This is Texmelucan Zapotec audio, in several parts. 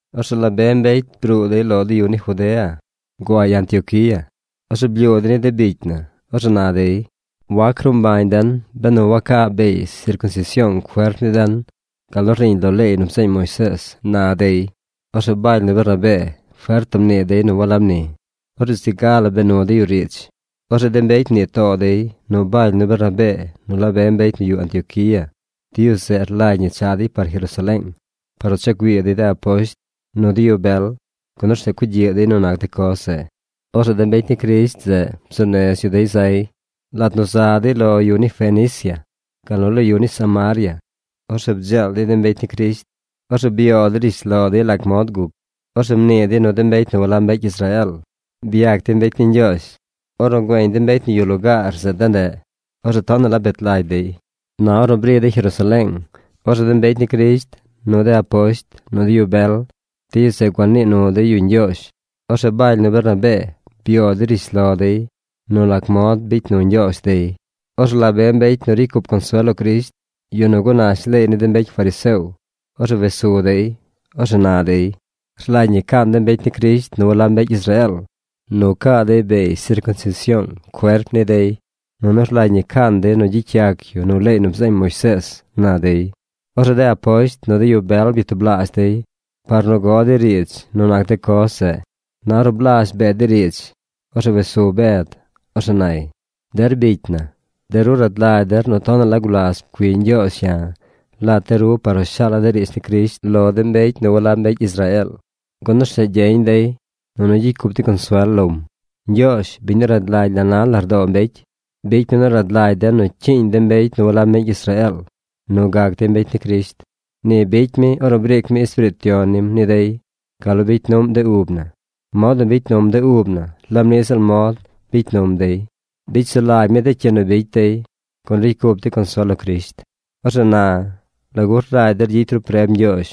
Orzeꞌ la be mbecy bruu dey lo de yu ni Judea guay Antioquía. Orzeꞌ blyuu dey ni de bicy na. Orzeꞌ na dey: ―Wac ruu mbañ den benu waca beey sircunsision cuerp ni den gal nu rniiñ lo leey nu bzeeñ Moisees ―na dey. Orzeꞌ Baly nu Bernabee fert la mnii dey nu walab ni. Orzeꞌ zi ga la bee nu dey yu riidz. Orzeꞌ de mbecy mnii too dey nu Baly nu Bernabee nu la be mbecy nu yuꞌ Antioquía, de yu zeꞌ rlagy ñi cha dey par Jerusaleeng par nu cha güii dey de aposht nu de yu bel, gun orzeꞌ cugyiꞌ dey nu nac de coz zeꞌ. Orzeꞌ de mbecy ni Crisht zeꞌ bzuu nez yu dey zay. Lat nu za dey lo yu ni Fenicia gal nu lo yu ni Samaria, orzeꞌ bdzeel dey de mbecy ni Crisht. Orzeꞌ byoo dey rishlo dey lac mod guc. Orzeꞌ mnii dey nu de mbecy nu walab mbecy Israeel byac dey mbecy ni Ñgyoozh. Ornu güeñ de mbecy nu yuꞌ lugaar zeꞌ ndeꞌ, orzeꞌ tonaꞌ la bet lagy dey. Na ornu bri dey Jerusaleeng, orzeꞌ de mbecy ni Crisht, nu de aposht, nu de yu bel, de yu zeꞌ gua nii nu dey yu ñgyoozh. Orzeꞌ Baly nu Bernabee byoo dey rishlo dey nu lac mod bicy nu Ñgyoozh dey. Orzeꞌ la be mbecy nu ricy cup consuel lo Crisht, yu nu gunash leey ni de mbecy fariseo, orzeꞌ wes su dey. Orzeꞌ na dey: ―Rlagy ñi caan de mbecy ni Crisht nu walab mbecy Israeel nu caa dey beey sircunsision cuerp ni dey, nunu rlagy ñi caan dey nu gyicy yac yu nu leey nu bzeeñ Moisees ―na dey. Orzeꞌ de aposht nu de yu bel byatublaazh dey par nu go dey riidz nu nac de coz zeꞌ. Na ornu blazh bee dey riidz, orzeꞌ wes su Bed. Orzeꞌ nay: ―Der bicy na, de ru rad lagy der nu tonaꞌ la gulas pcui Ñgyoozh ya̱ lat de ru par nu shaala̱ de riidz ni Crisht lo de mbecy nu walab mbecy Israeel, gun orzeꞌ gyeñ dey, nunu gyicy cup dey consuel lom. Ñgyoozh, biñ nu rad lagy la na lardoo mbecy, bicy mi nu rad lagy den nu cyiiñ de mbecy nu walab mbecy Israeel nu gac dey mbecy ni Crisht. Ni bicy mi ornu briic mi Espiriit Yon nim ni dey gal nu bicy nuꞌm de ub na. Mod nu bicy num de ub na laab niꞌ ziꞌl mod bicy num dey. Bicy sulagy mi de cyi nu bicy dey, gun ricy cup dey consuel lo Crisht. Orzeꞌ na ¿lagu rlagy der gyicy ru preb Ñgyoozh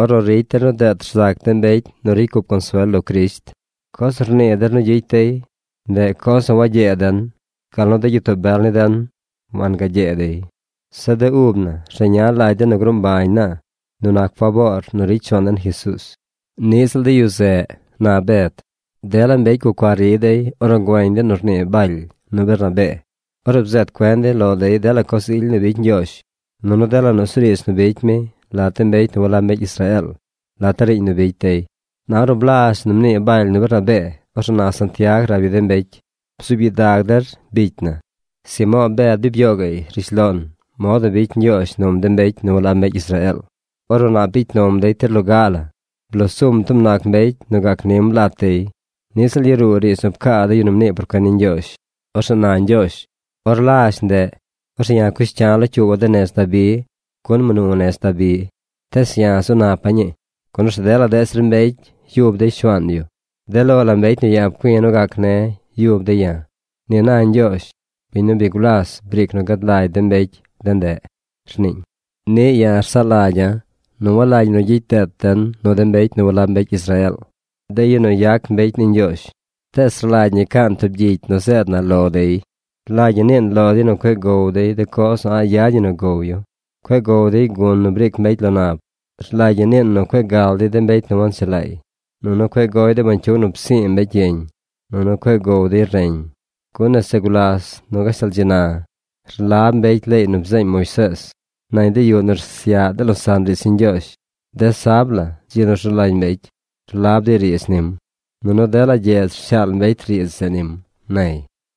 ornu ricy der nu deet rzac de mbecy nu ricy cup consuel lo Crisht? Coz nu rnii der nu gyicy dey, ndeꞌ coz nu wagyee den, gal nu de gyitoo bel ni den wangagyee dey. Zeꞌ de ub na rzeña lagy den nu gruu mbañ na nu nac faboor nu ricy nu Shuaan den Jesuuz. Niꞌ ziꞌl de yu zeꞌ ―na Bed. Dela mbecy gucua ri dey ornu güeñ dey nu rnii Baly nu Bernabee, ornu bzeed cuen dey lo dey dela coz ily nu bicy Ñgyoozh, nunu dela nusuriidz nu bicy mi lat de mbecy nu walab mbecy Israeel lat de riiñ nu bicy dey. Na or blazh nu mnii Baly nu Bernabee, orzeꞌ na Santiag rab yu de mbecy: ―Bzuub gyidag der, bicy na. Simo̱o̱ Bed bi byoo gaꞌy rishlon mod nu bicy Ñgyoozh num de mbecy nu walab mbecy Israeel ornu nap bicy num dey tir loga la. Bloo sum tub nac mbecy nu gac nim lat dey. Niꞌ ziꞌl yaruu riidz nu pcaa de yu nu mnii por cuen ni Ñgyoozh. Orzeꞌ na Ñgyoozh: Or lazh ndeꞌ, orzeꞌ ya̱ cush cya̱ locyuuba̱ de nez Dabi, gun mnu nez Dabi, tees ya̱ zu napa̱ ñii. Gun orzeꞌ dela deꞌ zir mbecy yub dey Shuaan yu. De lo la mbecy nu ya̱ pcui̱ nu gac ne̱ yub dey ya̱. Ni na Ñgyoozh, biñ nu bi gulas briic nu gad lagy de mbecy de ndeꞌ, rniiñ. ’Niꞌ ya̱ rsaꞌ lagya̱ nu walagy ñi nu gyicy deet den nu de mbecy nu walab mbecy Israeel, de yu nu yac mbecy ni Ñgyoozh. Tees rlagy ñi caan tub gyicy zeed na lo dey. Rlagy ñi niin lo dey nu cueꞌ gow dey de coz nu a̱ꞌ yad ñi nu gow yu. Cueꞌ gow dey de gun nu briic mbecy lo nab. Rlagy ñi niin nu cueꞌ gal dey de mbecy nu wanchelaay, nunu cueꞌ gow dey bañcyug nu psi̱i̱ mbecy yeñ, nunu cueꞌ gow dey reñ. Gun nese gulas nu gashtal dzi na rlab mbecy leey nu bzeeñ Moisees nañ de yuꞌ nu rsyaꞌ de losaꞌn riidz ni Ñgyoozh. De sab la, dzi nu rzu lagy mbecy, rlab dey riidz nim, nunu dela gyedz rshaal mbecy riidz zeꞌ nim ―nay.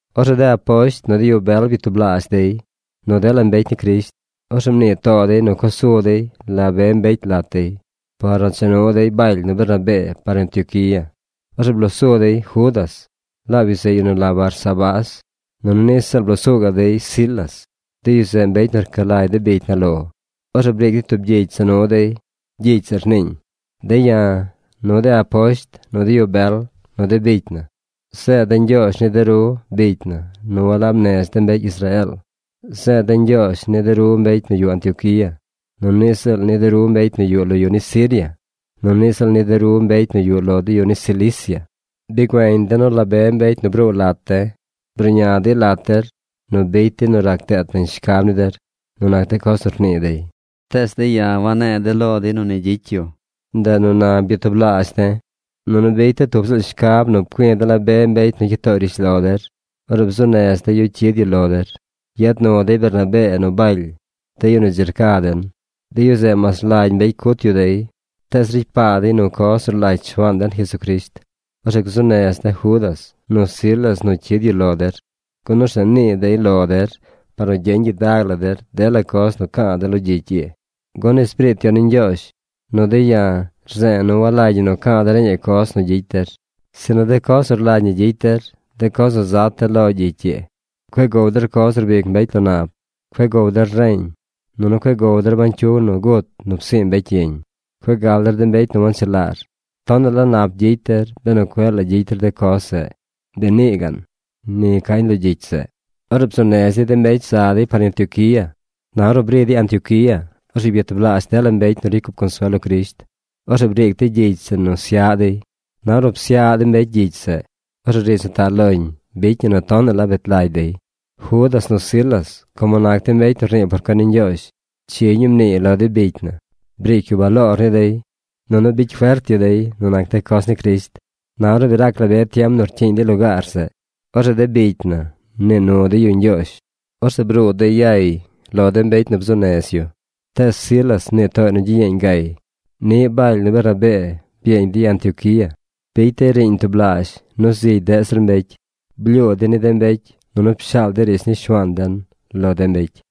Orzeꞌ de aposht, nu de yu bel byatublaazh dey, nu dela mbecy ni Crisht. Orzeꞌ mnii too dey nu co su dey la be mbecy lat dey, par nu cha nu dey Baly nu Bernabee par Antioquía. Orzeꞌ bloo su dey Judas, laab yu zeꞌ yu nu la Barsabás, nunu niꞌ ziꞌl bloo su gaꞌ dey Silas. De yu zeꞌ mbecy nu rca lagy de bicy na lo. Orzeꞌ briic dey tub gyicy za nu dey. Gyicy zeꞌ rniiñ: “De̱ ya̱, nu de aposht, nu de yu bel, nu de bicy na, zeed de̱ ñgyoozh ni de ru bicy na nu walab nez de mbecy Israeel. Zeed de̱ ñgyoozh ni de ru mbecy nu yuꞌ Antioquía, nunu niꞌ ziꞌl ni de ru mbecy nu yuꞌ lo yu ni Siria, nunu niꞌ ziꞌl ni de ru mbecy nu yuꞌ lo de yu ni Cilicia. Bi güeñ de̱ nu la be mbecy nu bruu lat de̱ bruꞌña dey lat der nu bicy dey nu rac deet nañ shcab ni der nu nac de coz nu rnii dey. Tees de̱ ya̱ wanne̱e̱ de̱ lo dey nu ni gyicy yu. Ndeꞌ nu na byatublaazh de̱, nunu bicy de̱ tub ziꞌl shcab nu pcui̱ de̱ la be mbecy nu cyid tooy rishlo der. Orzeꞌ bzuu nez de̱ yu cyid yu lo der. Yad nu dey Bernabee nu Baly, de yu nu dzi rca den. De yu zeꞌ mas rlagy mbecy cut yu dey, tees ricy paa dey nu coz nu rlagy Shuaan den Jesucrisht. Orzeꞌ gzuu nez de̱ Judas, nu Silas nu cyid yu lo der, gun orzeꞌ nii dey lo der par nu gyeñ gyidag la der dela coz nu ca̱a̱ de̱ lo gyicy ii. Gun Espiriit Yon ni Ñgyoozh nu de̱ ya̱ rze̱e̱ nu walagy ñi ca̱a̱ de̱ reñaꞌ coz nu gyicy der, sinu de coz nu rlagy ñi gyicy der, de coz nu zat de̱ lo gyicy ii. Cueꞌ gow der coz nu rbic mbecy lo nab. Cueꞌ gow der reñ, nunu cueꞌ gow der bañcyug nu gut nu psi̱i̱ mbecy yeñ. Cueꞌ gal der de mbecy nu wanchelaar. Tonaꞌ la nap gyicy der benu cueꞌ la gyicy der de coz zeꞌ. Bi nii gaꞌn.” Ni cañ lo gyicy zeꞌ. Orzeꞌ bzuu nez dey de mbecy zeꞌ za dey par Antioquía. Na ornu bri dey Antioquía, orzeꞌ byatublaazh dela mbecy nu ricy cup consuel lo Crisht. Orzeꞌ briic dey gyicy zeꞌ nu syaꞌ dey. Na ornu psyaꞌ de mbecy gyicy zeꞌ, orzeꞌ riidz nu taꞌ loñ bicy ñi nu tonaꞌ la bet lagy dey. Judas nu Silas, como nac dey mbecy nu rnii por cuen ni Ñgyoozh, chi ñuu mniiy lo de bicy na. Briic yu baloor ni dey, nunu bicy fert yu dey nu nac de coz ni Crisht. Na ornu bi rac la be tiem nu rcyiiñ dey lugaar zeꞌ, orzeꞌ de bicy na mnii nu dey yu ñgyoozh. Orzeꞌ bruu dey yay lo de mbecy nu bzuu nez yu. Tees Silas mnii tooy nu gyiyeeñ gay. Niꞌ Baly nu Bernabee byeeñ dey Antioquía. Bicy dey riiñ tublaazh nu zigy deꞌ zir mbecy. Blyuu dey ni de mbecy, nunu pshaal dey riidz ni Shuaan den lo de mbecy.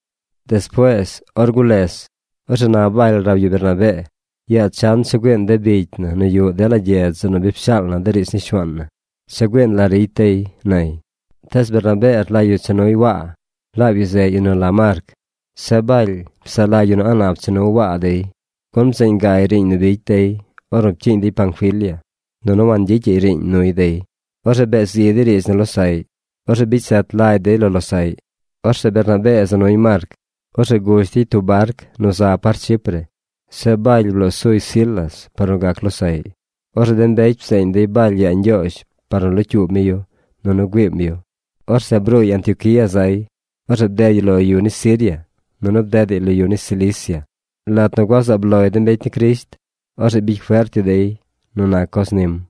Despuees, or gules, orzeꞌ na Baly rab yu Bernabee: ―Yaa chan cha güiin de bicy na nu yuꞌ dela gyedz zeꞌ nu pshaal na de riidz ni Shuaan na. Cha güiin la ricy dey ―nay. Tees Bernabee rlagy yu cha nuy Waa. Laab yu zeꞌ yu nu la Marc. Zeꞌ Baly psaꞌ lagy yu nu a̱ꞌ nap nu cha nu Waa dey, gun bzeen gay riiñ nu bicy dey ornu pcyiiñ dey Panfilia, nunu wangyicyaꞌy riiñ nuy dey. Orzeꞌ bee zi dey riidz nu losaꞌy. Orzeꞌ bicy zet lagy dey lo losaꞌy. Orzeꞌ Bernabee za nuy Marc. Orzeꞌ gush dey tub barc nu za par Chipre. Zeꞌ Baly bloo suy Silas par nu gac losaꞌy. Orzeꞌ de mbecy bzeeñ dey Baly yaa Ñgyoozh par nu locyuub mi yu, nunu güiim yu. Orzeꞌ bruuy Antioquía zay. Orzeꞌ bded yu lo yu ni Siria, nunu bdedaꞌy lo yu ni Cilicia. Lat nu gua zaab loy de mbecy ni Crisht, orzeꞌ bicy fert yu dey nu nac coz nim.